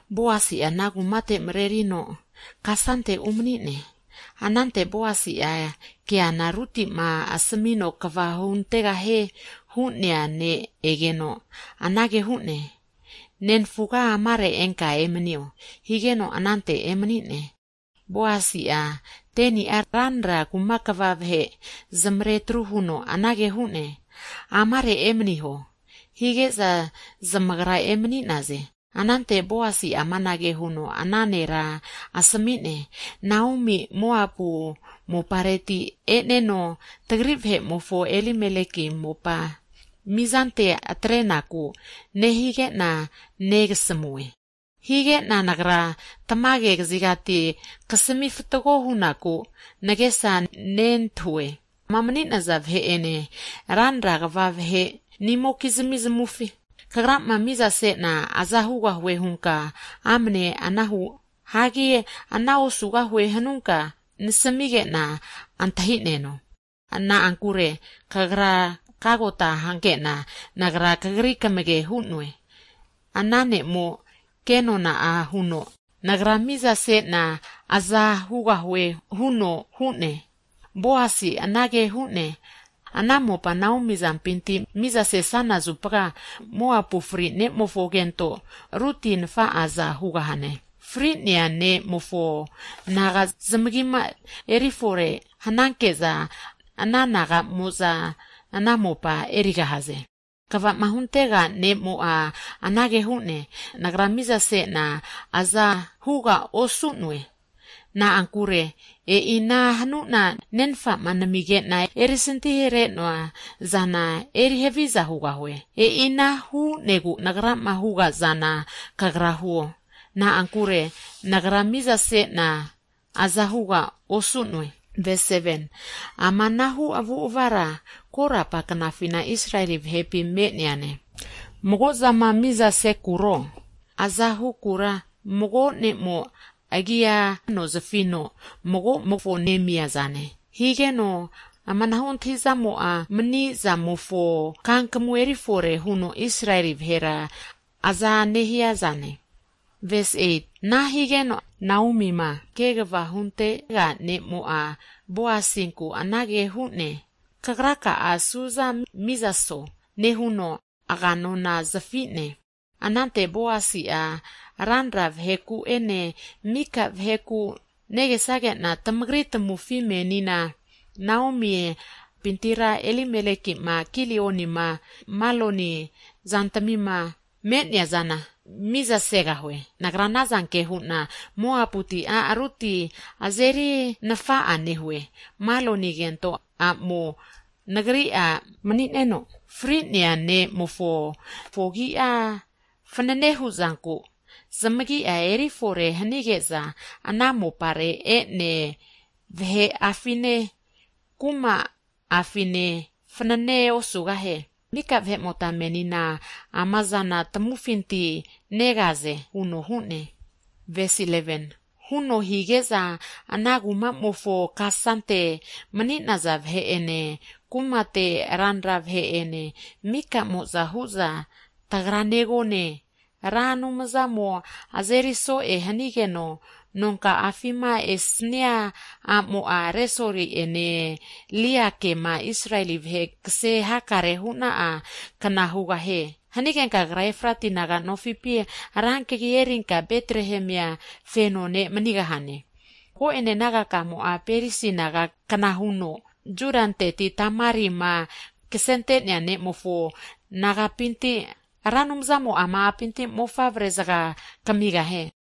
Boasi'a ana kumate mrerino kasante umani'ne. Anante Boasi'a keana, Rutima asmino kva huntegahie hu'nea ne' egeno, anage hu'ne, Nenfuga amare enka emnio, higeno anante emani'ne. Boasi'a 10ni'a ranra kuma kva vahe, zamare atru huno anage hu'ne, Amare emniho, hige'za zamagra emani'naze. Anante Boasi amanage huno ana nera asmi'ne, Naomi Moabu mopareti e'neno, tagri vahe'mofo Elimeleki mopa mizante atrenaku nehige'na negasmue. Hige'na nagra tmage kazigati kasami fatgo hunaku nagesa nentahue. Amama mani'naza vahe'ene, ranra kva vahenimokizmi zamufi, kagrama miza sena aza hugahue hanunka, amne ana huo, hagi ana osugahue hanunka, nasmige'na antahi'neno. Na'ankure kagra kagota hanke'na, nagra kagri kamage hu'noe. Ana ne'mo kenona huno, nagra mizase'na aza hugahue huno hu'ne. Boasi'a anage hu'ne, Ana mopa Naomi azampinti miza sesana zupa, Moabu fri'nemofo kento, Rutina nfa'aza hugahane, fri'nea ne'mofo naga zamagima erifore hnanke'za, ana naga'mo'za ana mopa erigahaze. Kvama huntega ne'mo'a anage hu'ne, Nagra mizase'na azahuga osu'noe, na'ankure e'ina hanu'na nenfama namige'na erisanti hare'noa zana eri haviza hugahue. E'ina hu'negu nagrama huga'zana kagra huo. Na'ankure nagra mizase'na azahuga osu'noe. Amanahu avu'avara, korapa knafi'na Israeli vahepi me'neane. Mago'zama mizasekuro, azahu'kura, mago ne'mo agia ano zafino mago'mofo nemia zane. Higeno amanahu antahi'zamo'a mani'zamofo kankamu erifore huno Israelia vahera aza nehia zane. Ana higeno, Naomima kegva huntega ne'mo'a, Boasinku anage hu'ne, Kagraka'a suza miza'so, nehuno aga nona zafi'ne. Anante Boasi'a ranra vaheku'ene, mika vaheku anage hu'ne, tamagra negesage'na tamagri tamufi menina Naomi azampintira, Elimelekima, Kilioni'ma, Maloni zantami'ma me'neana, nagra miza segahue. Nagra ana zanke hu'na, Moaputi a' Rutina azeri nfa'a nehue, Maloni kento a'mo nagri a' mani'neno, fri'nea ne'mofo agi fnane hu'zanku zamagia erifore hanige'za ana mopare ene, vahe'afine, kuma'afinena fanane osugahie. Mika vahe'mota menina amazana tamufinti negaze, huno higeno ana kumamofo kasante mani'naza vahe'ene, kumate ranra vahe'ene mika'moza hu'za, Tagra negone, Ra Anumzamo azeri so'e hanigeno nonka'afima esnia a'mo'a, Resoli'ene, Liakema, Israeli vahe kse hakare huna'a kna hugahie. Hanigenka kagra Efrati naga nofipi ra kagi erinka Betrehemia feno ne' manigahane. Mago'ene nagakamo'a, Peresi naga kna huno, Judanteti Tamari'ma ksente'nea ne'mofo nagapinti, Ra Anumzamo ama a'pinti mofavre zga kmigahie.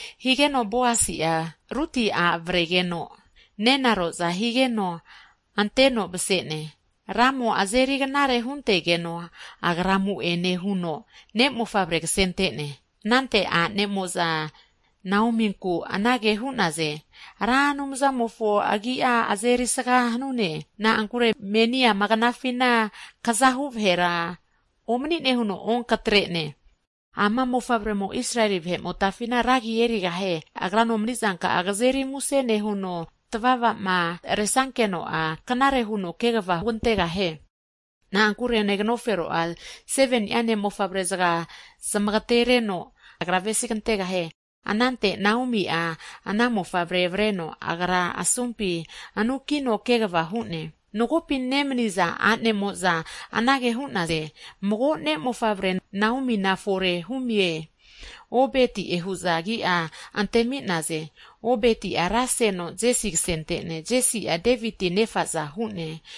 Higeno Boasi'a, Ruti a' avregeno nenaro'za higeno, anteno mse'ne. Ramo azeri knare huntegeno agra amu'ene huno ne'mofavre ksente'ne. Anante a'nemo'za Naominku anage hu'naze, Ra Anumzamofo agi'a erisga hanune, na'ankure meni ama knafina kzahu vahera omni'ne huno onkatre'ne. Ama mofavremo Israeli vahe motafina ragi erigahie. Agra nomni zanka'a kzeri muse nehuno tvava'ma resankeno'a knare huno kegva hugantegahie, na'ankure neganofero'a, seveni'a ne'mofavre zga zamagatere'no, agra avesi kantega'hie! Anante Naomi'a ana mofavre avreno, agra'a asumpi anu'kino kegva hu'ne. Magopi nemniza a'nemo'za, anage hu'naze, Mago ne'mofavre Naomi'na fore humie! Obeti'e hu'za agi'a antemi'naze. Obeti'a raseno Jesi ksentegeno, Jesi'a, Deviti nefaza hu'ne!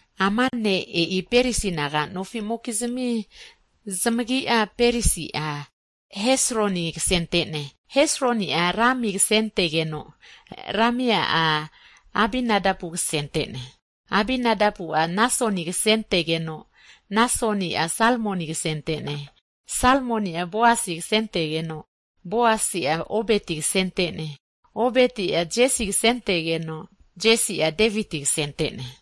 Ama'ne e'i Peresi naga'nofimokizmi zamagi'e, Peresi'a, Hesroni ksente'ne, Hesroni'a, Rami ksentegeno, Rami'a, Aminadabu ksente'ne. Aminadabu'a, Nasoni ksentegeno, Nasoni'a, Salmoni ksente'ne. Salmoni'a, Boasi ksentegeno Boasi'a, Obeti ksente'ne. Obeti'a, Jesi ksentegeno, Jesi'a, Deviti ksente'ne.